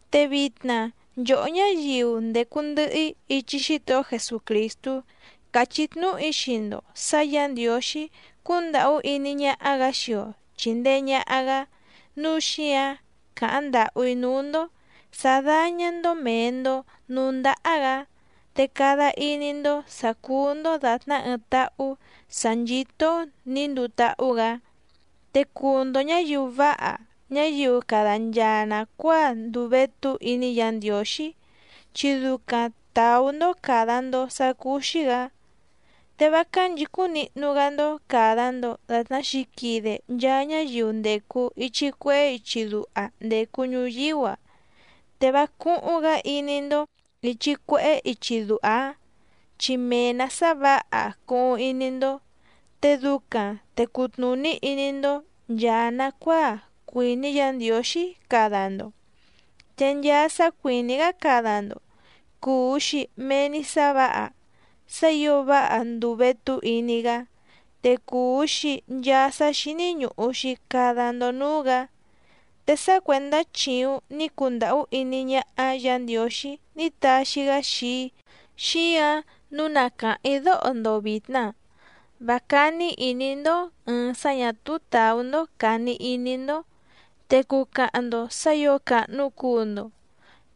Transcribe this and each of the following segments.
Te vitna nchòhó ñáyiu ndècu ndɨhɨ‑í ichi Xítohó Jesucrìstú càchí tnúhu‑í xii‑ndo sǎ Yǎ Ndiǒxí cúndàhú iní ñáhá‑gǎ xii‑o chìndee ñaha‑gá, núu xíǎⁿ càháⁿ ndàhú‑í núú‑ndó sǎ dáñá‑ndó mèe‑ndo núú ndáhá‑gǎ, te cada iní‑ndó sǎ cúú‑ndó dàtná ɨɨⁿ táhú sǎ nchító‑ó nǐ nduu táhú‑gǎ. Te cuu‑ndo ñǎyiu váha ñáyiu cada nchaa nàcuáa nduu vétú iní Yǎ Ndiǒxí chi ducaⁿ tàú‑ndó càda‑ndo sá cúú‑xí‑gǎ. Te vá cánchìcúⁿ nihnu‑gá‑ndó càda‑ndo datná xǐquide nchaa ñáyiu ndècu ichi cuehé ichi duha ndècu ñuyíú‑a, te vá cúhúⁿ‑gǎ iní‑ndó ìchi cuehé ichi duha‑áⁿ, chi mee‑nǎ sá vǎha cuhuⁿ iní‑ndó, te ducaⁿ te cutnùní iní‑ndó nchàa nacuáa cuìní Yǎ Ndiǒxí cada‑ndo, te nchaa sá cuìní‑gá cada‑ndo cùu‑xi mee‑ni sá vǎha, sá ǐo váha ndùu vétú iní‑gá, te cùu‑xi nchaa sá xíní ñùhu‑xi cada‑ndo núú‑gǎ. Te sá cuèndá chìuⁿ ní cundàhú iní ñáhá Yǎ Ndiǒxí ní taxi‑gá xii‑í xíǎⁿ nǔu na càháⁿ‑í dóho‑ndo vìtna: Vá cání ìní‑ndó ɨ̀ɨⁿ sá ñà túú tàú‑ndó càni iní‑ndó te cucahaⁿ‑ndo sǎ ǐo càhnu cuu‑ndo.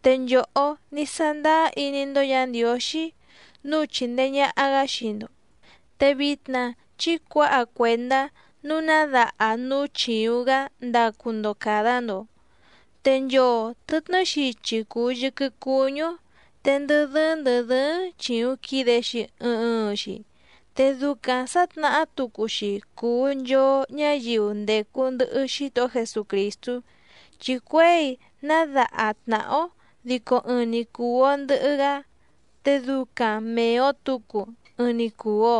Te nchòhó ní sándáá iní‑ndó Yǎ Ndiǒxí nǔu chìndee ñaha‑gá xii‑ndo, te vitna chí cuǎha cuèndá nǔu ná daha núú chìuⁿ‑gá ndacu‑ndo càda‑ndo. Te nchoo tɨ̀tnɨ́ xichi cùu yɨquɨ cuñú‑ó, te ndɨ dɨ́ɨ́ⁿ ndɨ̀ dɨ́ɨ́ⁿ chìuⁿ quide‑xi ɨɨⁿ ɨɨⁿ‑xi. Te ducaⁿ sǎtnahá tucu‑xi cùu nchoo ñáyiu ndècu ndɨhɨ Xítohó Jesucrìstú chi cuěi ná daha tnàhá‑ó dico ɨɨⁿ‑ni cùu‑o ndɨhɨ‑gá, te ducaⁿ mèe‑o tucu ɨɨⁿ‑ni cùu‑o.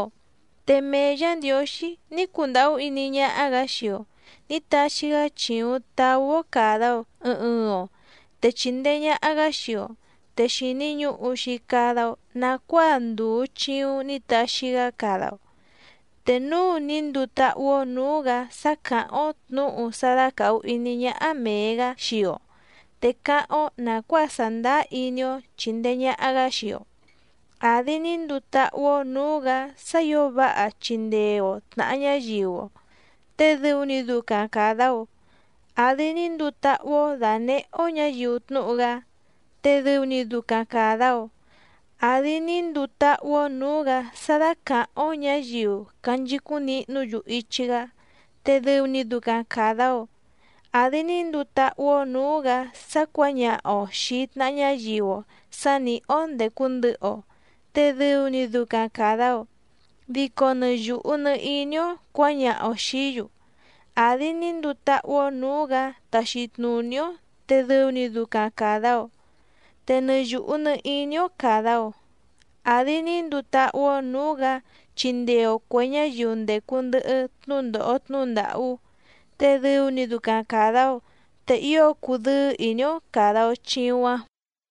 Te mee Yǎ Ndiǒxí ní cundàhú iní ñáhá‑gǎ xii‑o nǐ taxi‑gá chìuⁿ taú‑ó càda‑o ɨɨⁿ ɨɨⁿ‑o te chìndee ñaha‑gá xii‑o, te xìni ñuhu‑xi cada‑o nacuáa ndùu chiuⁿ ní taxi‑gá cada‑o. Te núu ní nduu táhú‑ó nǔú‑gǎ sá càháⁿ‑ó tnǔhu sá dácàhu iní ñáhá mèe‑gá xii‑o te cáháⁿ‑ó nàcuáa sàndáá iní‑ó chìndee ñaha‑gá xii‑o, àdi ní nduu táhú‑ó nǔú‑gǎ sá ǐo váha chindee‑o tnàha ñáyiu‑o te dɨu‑ni ducaⁿ càda‑o, àdi ní nduu táhú‑ó dànehé‑ó ñǎyiu tnúhu‑gá te dɨu‑ni ducaⁿ càda‑o, àdi ní nduu táhú‑ó nǔú‑gǎ sá dácàháⁿ‑ó ñǎyiu canchicúⁿ nihnú‑yu ichi‑gá te dɨu‑ni ducaⁿ càda‑o, àdi ní nduu táhú‑ó nǔú‑gǎ sá cuǎñaha‑o xìi tnaha ñáyiu‑o sǎ nìhí‑ó ndècu ndɨhɨ‑o te dɨu‑ni ducaⁿ càda‑o, dico nɨ yùhu nɨ iní‑ó cuǎñaha‑o xìí‑yu, àdi ní nduu táhú‑ó nǔú‑gǎ taxi tnùní‑ó te dɨu‑ni ducaⁿ càda‑o, te nɨ yùhu nɨ iní‑ó càda‑o, àdi ní nduu táhú‑ó nǔú‑gǎ chindee‑o cuè ñáyiu ndècu ndɨhɨ tnúndòho tnúhu ndàhú te dɨu‑ni ducaⁿ càda‑o, te ío cudɨ́ɨ́ ìní‑ó càda‑o chiuⁿ‑áⁿ.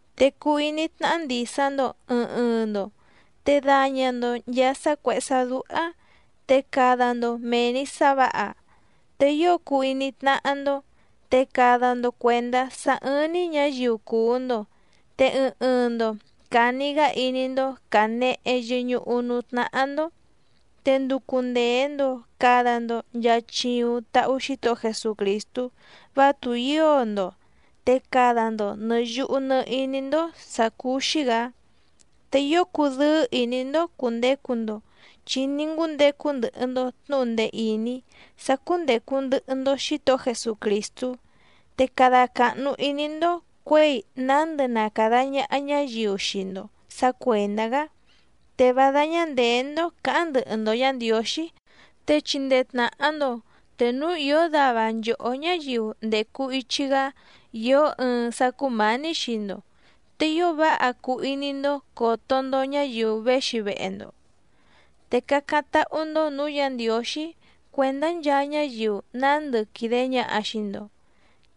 Te cuu iní tnáhá ndìsa‑ndo ɨɨⁿ ɨɨⁿ‑ndo, te daña‑ndo nchàa sá cuèhé sá dúhá te cada‑ndo mèe‑ni sá vǎha. Te ío cuu iní tnáhá‑ndó, te cada‑ndo cuèndá sá ɨ́ɨ́ⁿ‑ní ñǎyiu cùu‑ndo, te ɨɨⁿ ɨɨⁿ‑ndo càni‑gá iní‑ndó cànehe yɨñuhu núú tnáhá‑ndó. Te nducu ndèe‑ndo cada‑ndo nchaa chiuⁿ tahu Xítohó Jesucrìstú vá tùhío‑ndo, te cada‑ndo nɨ̀ yuhu nɨ iní‑ndó sǎ cúú‑xí‑gǎ. Te ío cudɨ́ɨ́ ìní‑ndó cùndecu‑ndo chi ní ngúndecu ndɨhɨ‑ndo tnǔhu ndee ìní sá cúndècu ndɨhɨ‑ndo Xítohó Jesucrìstú, te cada càhnu iní‑ndó cuěi nándɨ na càda ñaha ñáyiu xii‑ndo sǎ cuèndá‑gá, te vá dáñá ndèé‑ndó cǎháⁿ ndɨhɨ‑ndo Yǎ Ndiǒxí. Te chindee tnàha‑ndo te núu ìó dava nchòhó ñáyiu ndècu ichi‑gá ìó ɨɨⁿ sá cúmǎní xii‑ndo, te ío váha cuu iní‑ndó còto‑ndo ñáyiu véxi vehe‑ndo. Te cácáⁿ táhú‑ndó nǔú Yǎ Ndiǒxí cuèndá nchaa ñáyiu nándɨ quìde ñaha xii‑ndo,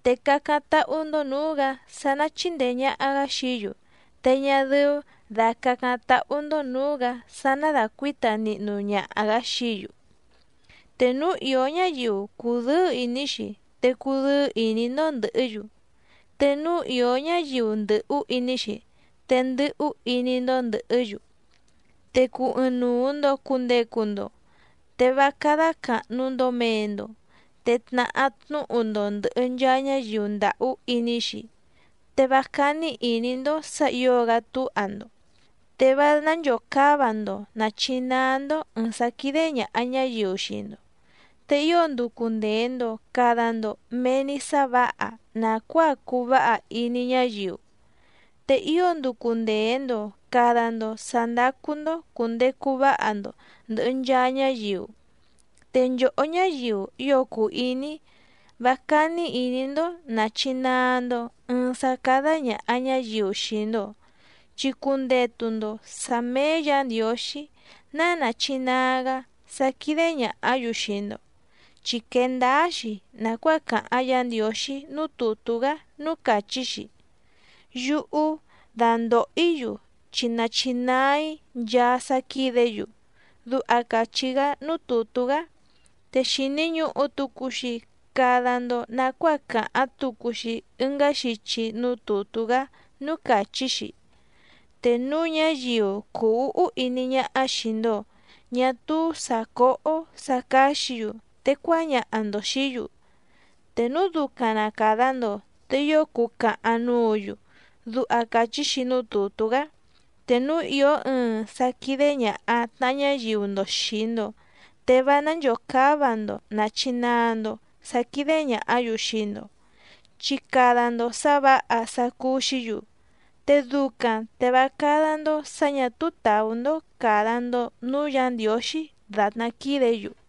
te cácáⁿ táhú‑ndó nǔú‑gǎ sá ná chìndee ñaha‑gá xií‑yu te ñá dɨ́ú dà cácáⁿ táhú‑ndó nǔú‑gǎ sá ná dàcuíta nihnu ñaha‑gǎ xií‑yu. Te núu ìó ñáyiu cùdɨ́ɨ́ ìní‑xi te cudɨ́ɨ́ ìní‑ndó ndɨ̀hɨ́‑yu, te núu ìó ñáyiu ndɨ̀hú iní‑xi te ndɨ́hú iní‑ndó ndɨ̀hɨ́‑yu. Te cuu ɨɨⁿnuu‑ndo cùndecu‑ndo, te vá cádá càhnu‑ndo mee‑ndo, te tnahá tnúhu‑ndo ndɨ̀hɨ nchaa ñáyiu ndàhú iní‑xi, te vá cání ìní‑ndó sǎ ǐo‑gá túha‑ndo. Te vá nánchòcáva‑ndo nàchinaa‑ndo ɨɨⁿ sá quídé ñàha ñáyiu xii‑ndo, te ío nducu ndèe‑ndo cada‑ndo mee‑ni sá vǎha nàcuáa cuu váha iní ñáyiu. Te ío nducu ndèe‑ndo cada‑ndo sá ndácú‑ndó cùndecu váha‑ndo ndɨ̀hɨ nchaa ñáyiu. Te nchòhó ñáyiu ío cùu iní‑í, vá cání ìní‑ndó nàchinaa‑ndo ɨɨⁿ sá cádá ñàha ñáyiu xii‑ndo, chi cundetu‑ndo sǎ méé Yǎ Ndiǒxí ná nàchinaa‑gá sá quídé ñàhá‑yu xii‑ndo, chi quee ndáá‑xi nàcuáa càháⁿ Yǎ Ndiǒxí núú tùtú‑gá núú càchí‑xi: “Yúhú dandòho‑í‑yu chi nachinaa‑í nchaa sá quídě‑yu”, duha càchí‑gá núú tùtú‑gá. Te xìni ñuhu tucu‑xi cada‑ndo nacuáa càháⁿ tucu‑xi ɨngá xichi núú tùtú‑gá núú càchí‑xi: “Te núu ñáyiu cùu úhú iní ñáhá xìi‑ndo ñá túú sǎ cóhó sǎ cáxǐ‑yu te cuáñaha‑ndo xìí‑yu, te núu ducaⁿ na càda‑ndo te ío cucahaⁿ núǔ‑yu”, duha càchí‑xi núú tùtú‑gá. Te núu ìó ɨɨⁿ sá quídé ñàha tnaha ñáyiu‑ndo xìi‑ndo te vá nánchòcáva‑ndo nàchinaa‑ndo sá quídé ñàhá‑yu xii‑ndo, chi cada‑ndo sǎ vǎha sá cúú‑xǐ‑yu, te ducaⁿ te vá cádá‑ndó sǎ ñà túú tàú‑ndó càda‑ndo núú Yǎ Ndiǒxí dàtná quídě‑yu.